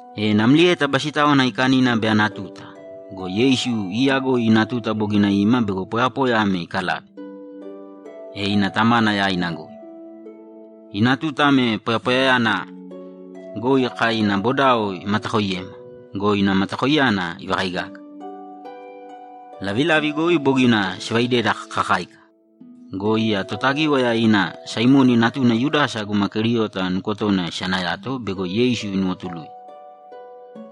E namlieta Basitáwana Aikanina bei ana tuta go, Yeisu iiyagoi ina tuta bogina ima bego poyapoya ame ikalave, e ina Tamana yaina goi. Ina tuta ame poyapoyayana goi kai ina bodao imatakoiyema go, ina matakoiyana ivakaigaga. Lavilavi goi bogina sivaideda kakakáika go, iya Totagíwaya ina Saimoni natuna Yudasa guma Keriota nukotona isanayato bego Yeisu inuwotuluye.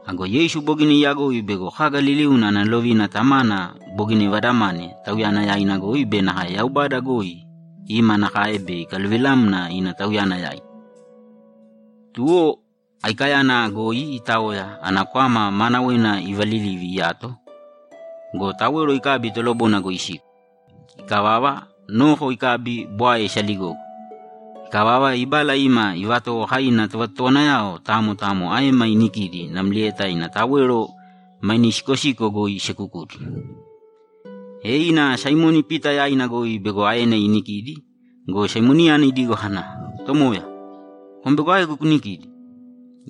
Ago Yeisu bogina iyagoi bego kaga liliuna ana lovina Tamana bogina ivadamane Tauyana yaina goi be nakae Yaubada goi ima nakae bei ikaluvilamna ina Tauyana yaina. Tuwo aikayana goi itaoya ana kwama maanawena ivalilivi iyato go, tawero ikabi tolobona goi isiko. Ikavava, noko ikabi bwae isaligogo. Ikavava, ibala ima ivatowo kai ina tovatotowanayao tamo tamo aema inikidi namlieta ina tawero maine isikosiko goi isekukudi. E ina Saimoni Pita yaina goi bego aena inikidi go, Saimoniyana idigo kana, ‘Tomoya, kom bego aegu kunikidi?’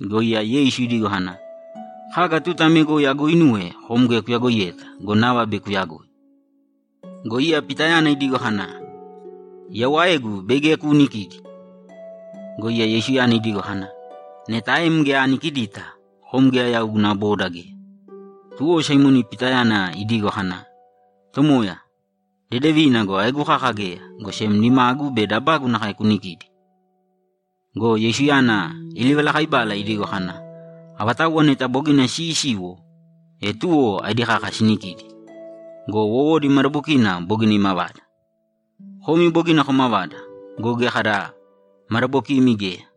Go iya Yeisu idigo kana, ‘Kaga tuta ame goi aguuinuwe kom geya kuyagoiyeta go, nava bei kuyagoi.’ Go iya Pitayana idigo kana, ‘Yau aegu bei geya kuunikidi!’ Go iya Yeisuyana idigo kana, ‘Neta aem geya anikidita, kom geya yau guna boda geya.’ Tuwo Saimoni Pitayana idigo kana, ‘Tomoya, dedevina go, aegu kaka geya, go sem nimagu be dabagu nakae kunikīdi!’ Go Yeisuyana ilivalakaibala idigo kana, ‘Avatauwa neta bogina siisiwo, e tuwo aedi kaka sinikidi go, wowodi madabokina bogina imavada. Komi bogina komavada go, geya kada madabokimi geya.’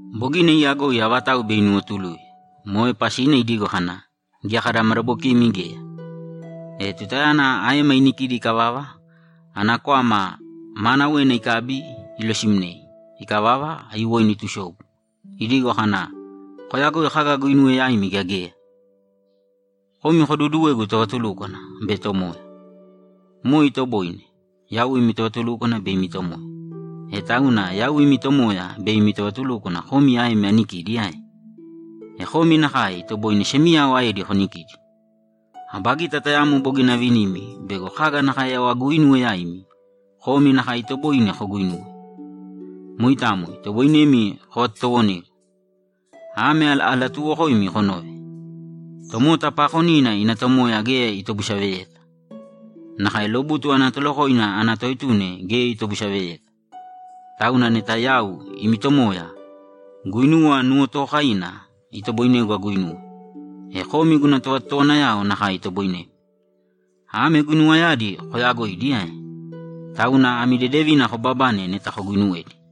Bogina iyagoi avatau bei inuwotuluye. Moe pasina idigo kana, ‘Geya kada madabokimi geya.’ E tutayana aema inikidi ikavava, ana kwama maanawena ikabi ilosimnei. Ikavava, aiyuwoina itusobu, idigo kana, ‘Koyagoi kaga aguinuwe yaimi gea geya? Komi koduuduwegu tovatulúkwana be Tomoya. Moe itoboine. Yau imi tovatulúkwana be imi Tomoya. E tauna yau imi Tomoya be imi tovatulúkwana komi aemi anikidi ae? E komi nakae itoboine semiyao aedi konikidi. Aba gita tayamo bogina avinimi bego kaga nakae yau aguuinuwe yaimi, komi nakae itoboine koguinuwe. Moitamo itoboinemi kovatotowonegu. Ame alatuuwokoimi konōve: Tomota paakonina ina tomoya geya itobusaveyeta. Nakae lobutu ana tolokoina ana toetuna geya itobusaveyeta. Tauna neta yau, imi Tomoya, guinuwa nuwotookaina itoboinegu aguinuwe, e komi guna tovatotowanayao nakae itoboinemi. Ame guinuwayadi koyaagoidi ae? Tauna ami dedevina kobabane neta koguuinuwedi.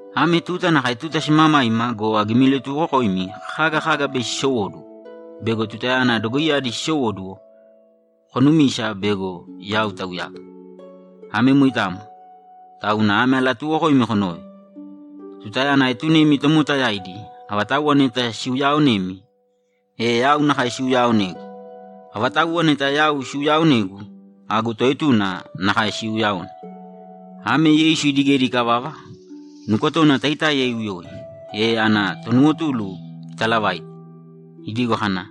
Ame tuta nakae tuta simamaima go, agimilatuwokoimi kaga kaga bei sisowóduwo bego tutayana dogoiyadi sisowóduwo, konumisa bego Yau Tauyagu. Ame moitamo, tauna ame alatuuwokoimi konōve: Tutayana aetunemi tomota yaidi, avatauwa neta siuyaaonemi, e yau nakae siuyaaonegu. E avatauwa neta yau siuyaaonegu, agu toetuna nakae siuuyaone.’ Ame Yeisu idigedi ikavava, nukotona taitáiya iuyoi, e ana tonuwotulu italavaite, idigo kana,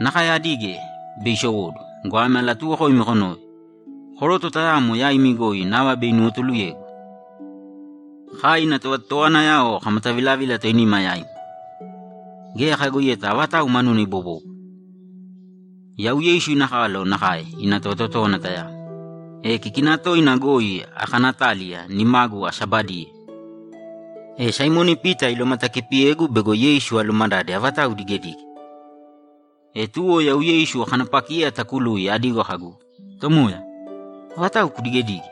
‘Nakae adige bei isowóduwo go, ame alatuuwokoimi konōve: Koroto tayamo yaimi goi nava bei inuwotuluyegu.’ Kai ina tovatotowanayao kamatavilavila toinima yaima, geya kayagoiyeta avatau manuna ibobóbwara. Yau Yeisu ina kalo nakae ina tovatotówana tayamo, e kikina toina goi akanaataliya nimagu asabadiye. E Saimoni Pita ilomatakipiyegu bego Yeisu alumadade avatau idigedige. E tuwo yau Yeisu akanapakiye atakului adigo kagu, ‘Tomoya, avatau kudigedige?’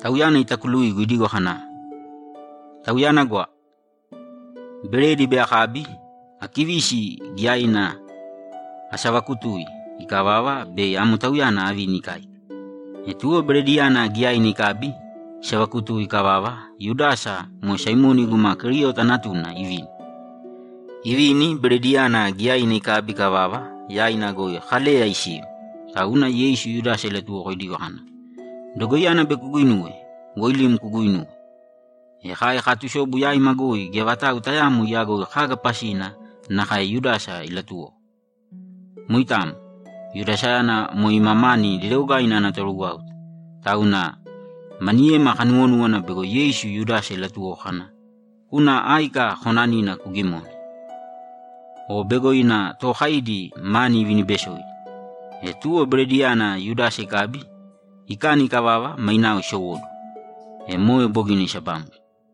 Tauyana itakuluigu idigo kana, ‘Tauyana gwa. Beredi bei akabi, akivisi giyaina asavakutui. Ikavava, bei amo tauyana avini ikáika.’ E tuwo berediyana giyaina ikabi, isavakutui ikavava, Yudasa, moe Saimoni guma Keriota natuna, ivini. Ivini, berediyana giyaina ikabi ikavava, yaina goi Kaleya isiu. Tauna Yeisu Yudasa ilatuwoko idigo kana, ‘Dogoiyana bei kuguinuwe, woilīm kuguuinūwe.’ E kai kaatusobu yaima goi geya vatau tayaamo iyagoi kaga pasina nakae Yudasa ilatuwoko. Moitamo. Yudasayana moe ima mani dedeogaina ana torugwáuta, tauna maniyema kanuwonúwana bego Yeisu Yudasa ilatuwoko kana, ‘Kūna áika konanina kugimōne.’ O bego ina tookaidi mani ivinibesoidi. E tuwo berediyana Yudasa ikabi, ikani ikavava, mainao isowóduwo. E moe bogina isabamgo.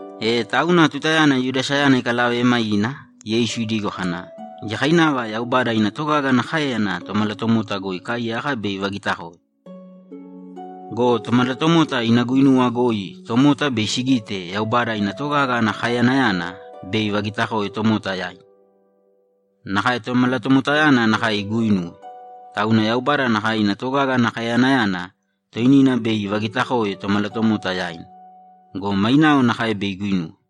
E tauna tutayana Yudasayana ikalavema ina, Yeisu idigo kana, ‘Giyakainava Yaubada ina togaga ana káeyana Tomalatomota goi ikaaiyaka bei ivagitakoe go, Tomalatomota ina guinuwa goi tomota bei sigite Yaubada ina togaga ana kaeyanayana bei ivagitakoe tomota yaidi. Nakae Tomalatomotayana nakae iguinuwe, tauna Yaubada nakae ina togaga ana kaeyanayana toinina bei ivagitakoe Tomalatomota yaina go, mainao nakae bei iguinuwe.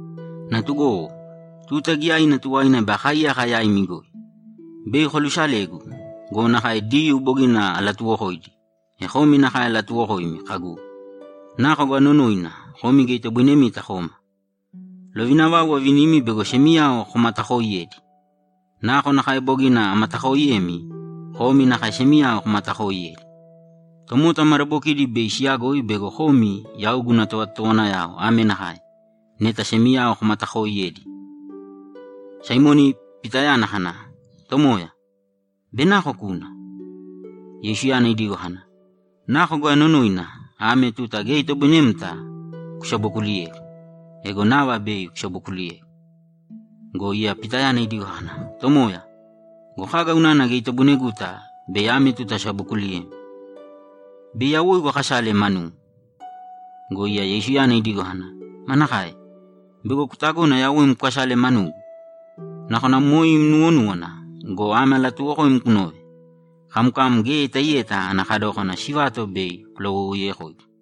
Natugowo, tuta giyaina tuwaina bei akaaiyaka yaimi goi. Bei kolusalegu go, nakae Diyuu bogina alatuwokoidi, e komi nakae alatuwokoimi kagu, “Nako goi anonoina, komi geya itoboinemita koma.” Lovina vau avinimi bego semiyao komatakooiyedi. Nakonakae bogina amatakooiyemi, komi nakae semiyao komatakooiyēdi. Tomota madabokidi bei siyagoi bego komi yau guna tovatotowanayao ame nakae: Neta semiyao komatakooiyedi.’ Saimoni Pitayana kana, ‘Tomoya, bei nako kuna?’ Yeisuyana idigo kana, ‘Nako goi anonoina, ame tuta geya itoboinemta kusabokuliyegu. Ego nava bei kusabokuliyegu.’ Go iya Pitayana idigo kana, ‘Tomoya, go kaga unana geya itoboineguta bei ame tuta asabokuliyem? Bei yawoigu akasale manum!’ Go iya Yeisuyana idigo kana, ‘Manakae? Bego kutagona yawoim kukasale manugu? Nakona moe im nuwonúwana go, ame alatuuwokoim kunōve: Kamkam geya itaiyeta ana kadókana sivato bei kulawoiwoiyekoigu.’